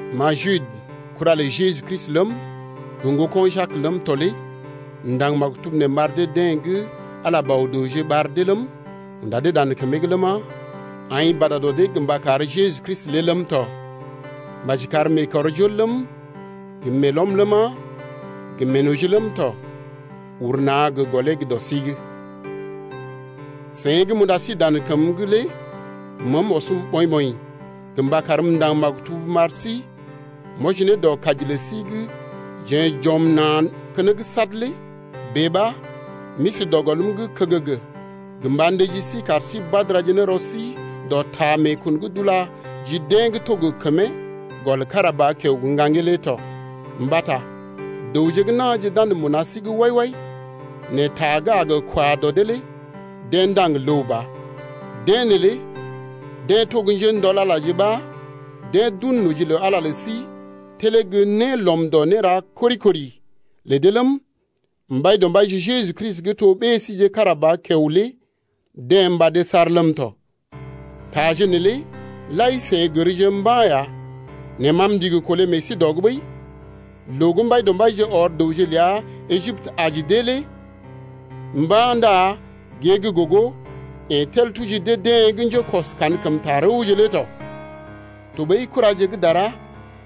Ma Jude, kura lə Jeju Kristi ləm, gə ŋgoko̰ Jak ləm tɔ lé m’ndaŋg maktub nee m’ar dee-deḛ gə́ Ala Bɔ-dəwje ɓar dee ləm, unda dee dan kəmee’g ləma, aḭ bada dɔ dee’g mba kar Jeju Kristi lé ləm tɔ. Maji kar meekɔrjol ləm gə meelɔm ləma, gə meenoji ləm tɔ, uru na̰ gə gɔlee gə́ dɔ sí’g. Seḭ gə́ m’unda sí dan kəm’g lé məəm ɔsm ɓɔḭ-ɓɔḭ gə mba karm m’ndaŋg maktub m’ar sí m’wɔji ne dɔ kaji lə sí gə́ jeḛ j’ɔm na̰ keneŋ sad lé. Bèe ɓa m’isi dɔ gɔlm’g kəgəgə gə mba ndəji sí kar sí badara ne rɔ sí dɔ ta meekun gə́ d’ula ji deḛ gə́ to gə kəmee gɔl kára ba kiao gə́ ŋgaŋgee lé tɔ. Mbata dəwje gə́ na̰je d’andə mbuna sí’g wai-wai, nɛ ta gə́ a gə kwa dɔ dee lé deḛ ndaŋg ləw ba. Deḛ neelé deḛ to njéndɔl-Alaje ɓa deḛ d’un noji lə Ala lə sí telee gə́ né lɔm dɔ néra gə́ kori-kori lə dee ləm, Mbaidɔmbaije Jeju Kristi gə́ to ɓée síje kára ba kiao lé deḛ mbadee saar ləm tɔ. Taje neelé lai seḭ gərje mba̰ ya nɛ ma m’ndigi kolé meḛ sí dɔ’g ɓəi. Loo gə́ Mbaidɔmbaije ɔr dəwje ləa Ejiptə’g aji dee lé mba̰ ndá gée gə́ gogo yeḛ tel tuji dee-deḛ gə́ njékɔs kankəmta rəwje lé tɔ. Tɔɓəi kuraje gə́ dara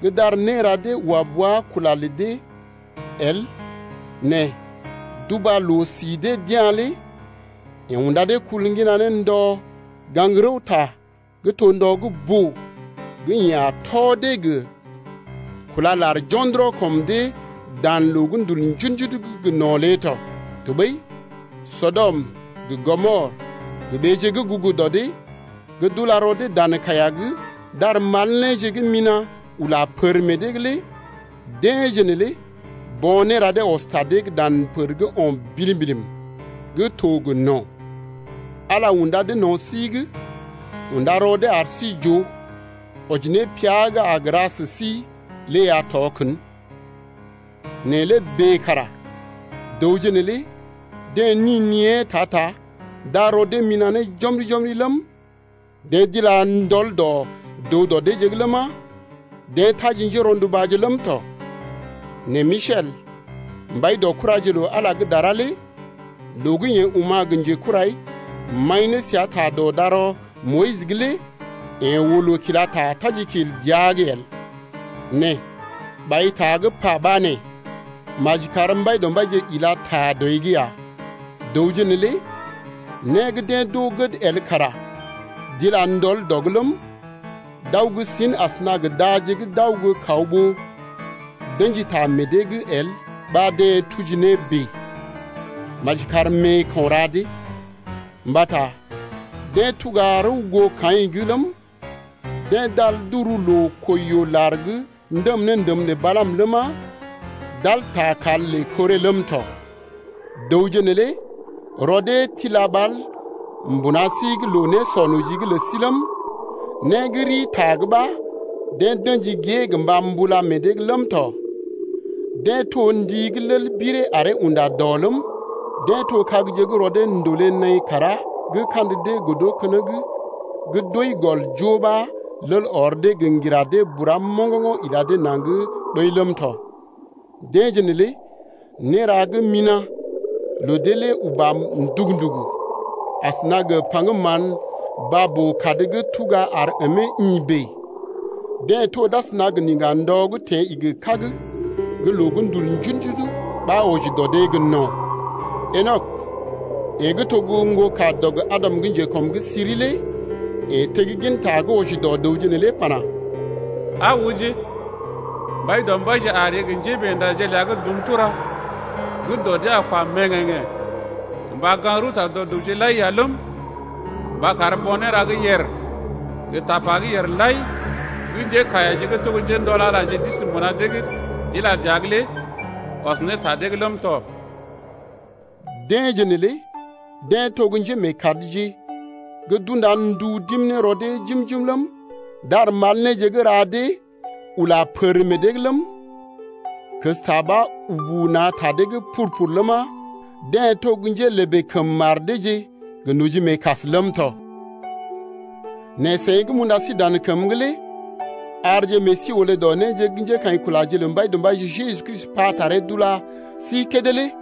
gə́ d’ar néra dee wa bua kula lə dee el nɛ d’uba loo-si dee d’ya̰ lé yeḛ unda dee kul ŋgina ne ndɔ gaŋg rəwta gə́ to ndɔ gə́ boo gə́ yeḛ a tɔ dee gə kúla lar jo̰dɔrɔ kɔm dee dan loo gə́ ndul njudu-njudu’g gə no̰ lé tɔ. Tɔɓəi Sɔdɔm gə Gɔmɔr gə ɓeeje gə́ gugu dɔ deḛ gə́ d’ula rɔ dee dan kaiya’g d’ar mal néje gə́ mina̰ ula pər meḛ dee’g lé deḛje neelé bo̰ néra dee ɔs ta dee’g dan pər gə́ o̰ bilim-bilim gə́ to gə no̰. Ala unda dee no̰ sí’g unda rɔ dee ar sí j’oo, wɔji ne pia gə́ a gə ra sə sí lé ya tɔ kən. Nɛ lé bèe kara dəwje neelé deḛ ni niée ta-ta d’ar rɔ dee mina̰ ne jɔmri-jɔmri ləm, deḛ d’ila ndɔl dɔ dəw dɔ deeje’g ləma, deḛ taji njérɔndubaje ləm tɔ. Nɛ Misel, mbai dɔ kuraje lə Ala gə́ dara lé loo gə́ yeḛ oma̰ gə njekurai maḭ ne səa ta dɔ darɔ Moyis’g lé yeḛ oo loo kila ta tajikil dəa’g el, nɛ ɓai ta gə́ pa ɓa nee: Maji kar Mbaidɔmbaije ila ta dɔi’g ya. Dəwje neelé né gə́ deḛ d’oo gəd el kara d’ila ndɔl dɔ’g ləm, d’aw gə́ sin asəna gə daje gə́ d’aw gə́ kaw ɓó d’ə̰ji ta meḛ dee’g el ɓa deḛ tuji ne bèe. Maji kar meeko̰ ra dee! Mbata deḛ tuga rəw goo Kaḭ’g ləm, deḛ d’al d’uru loo-kwəi-yoo-lar’g ndəm ne ndəm lə Balaam ləma, d’al ta kal lə Koré ləm tɔ. Dəwje neelé rɔ dee tila ɓal mbuna sí’g loo-nésɔ-noji’g lə sí ləm, né gə́ rii ta’g ɓa deḛ d’ə̰ji gée gə mba mbula meḛ dee’g ləm tɔ. Deḛ to ndi gə́ lel biree aree unda-dɔ ləm, deḛ to kagje gə́ rɔ dee ndòlé naḭ kàrá gə́ kandə dee godo keneŋ gə́ d’wəi gɔl joo ɓa lel ɔr dee gə ŋgira dee bura moŋgoŋgo̰ ila dee naŋg ɓəi ləm tɔ. Deḛje neelé néra gə́ mina̰ lə dee lé uba ndugu-ndugu asəna gə paŋgəm mán baa-boo-kad gə́ tuga ar əmee ḭ bèe. Deḛ to d’asəna gə niŋga-ndɔ gə́ teḛ igi kág gə́ loo gə́ ndul njudu-njudu ɓa wɔji dɔ dee gə no̰. Enɔk, yeḛ gə́ to ŋgokadɔg Adam gə́ njekɔm’g siri lé yeḛ tegginta gə́ wɔji dɔ dəwje neelé pana: Aa ooje, Mbaidɔmbaije a ree gə njémeendaje ləa gə́ dum tura gə́ dɔ dee a kwa mèŋgèŋgḛ̀ gə mba gaŋg rəwta dɔ dəwje’g lai ya ləm, mba kar bo̰ néra gə́ yèr lai gə tapa gə́ yèr lai gə́ njékaiyaje gə́ to njéndɔl-Alaje gə́ d’isi mbuna dee’g d’ila dəa’g lé ɔs ne ta dee’g ləm tɔ. Deḛje neelé deḛ to njémeekadje gə́ d’unda ndu d’im ne rɔ dee jim-jim ləm, d’ar mal néje gə́ ra dee ula pər meḛ dee’g ləm, kəsta ɓa ubu na̰ ta dee’g pur-pur ləma, deḛ to njélèbè kəm mar deeje gə nojimeekas ləm tɔ. Nɛ seḭ gə́ m’unda sí dan kəm’g lé arje meḛ sí olé dɔ néje gə́ njékaḭkulaje lə Mbaidɔmbaije Jeju Kristi pa taree d’ula sí kédé lé.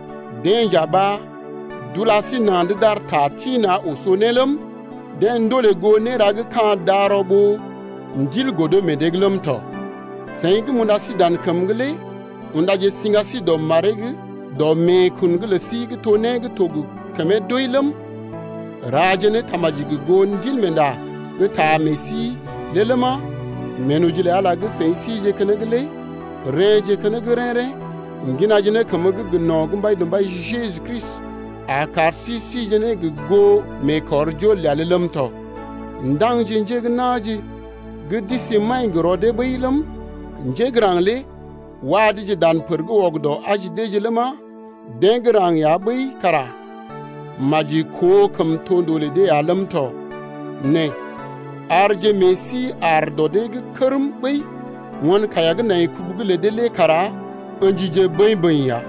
Deḛ nja ɓa d’ula sí na̰’d d’ar ta tḭ-na̰ oso ne ləm, deḛ ndolè goo néra gə́ ka̰ darɔ ɓó Ndil godo meḛ dee’g ləm tɔ. Seḭ gə́ m’unda sí dan kəm’g lé undaje siŋga sí dɔ maree’g dɔ meekun’g lə sí gə́ to né gə́ to gə kəmee doi ləm, raje ne tamaji gə goo Ndilmeenda gə́ taa meḛ sí lé ləma, meenoji lə Ala gə́ seḭ sije keneŋ lé rḛ́je keneŋ rḛ́-rḛ́ ŋginaje ne kəmə gə́ gə no̰ gə́ Mbaidɔmbaije Jeju Kristi a kar sí sije ne gə goo meekɔrjol ləa lé ləm tɔ. Ndaŋje njé gə́ na̰je gə́ d’isi maḭ gə rɔ dee ɓəi ləm, njé gə́ raŋg lé wa deeje dan pər’g wɔgədɔ aji deeje ləma, deḛ gə́ raŋg ya ɓəi kara maji koo kəmtondoo lə dee ya ləm tɔ nɛ arje meḛ sí aar dɔ dee’g kərm ɓəi, won kaiya gə́ nai kubu’g lə dee lé kara ə̰jije bəḭ-bəḭ ya.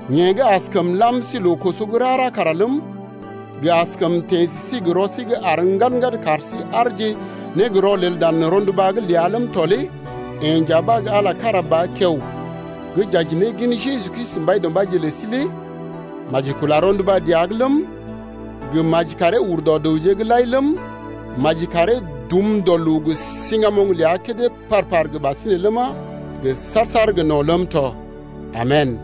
Yeḛ gə́ askəm lam sí loo-koso gə́ rara kara ləm, gə́ askəm teḛ sə sí gə rɔ sí gə́ àr ŋgad-ŋgad kar sí aarje ne gə rɔlel dan rɔnduba’g ləa ləm tɔ lé yeḛ nja ɓa gə́ Ala kára ba kiao, gə́ j’aji ne gin Jeju Kristi Mbaidɔmbaije lə sí lé maji kula rɔnduba dəa’g ləm, gə maji karee ur dɔ dəwje’g lai ləm, maji karee dum dɔ loo gə siŋgamoŋ ləa kédé par-par gə ɓasinè ləma, gə saar-saar gə no̰ ləm tɔ. Amen!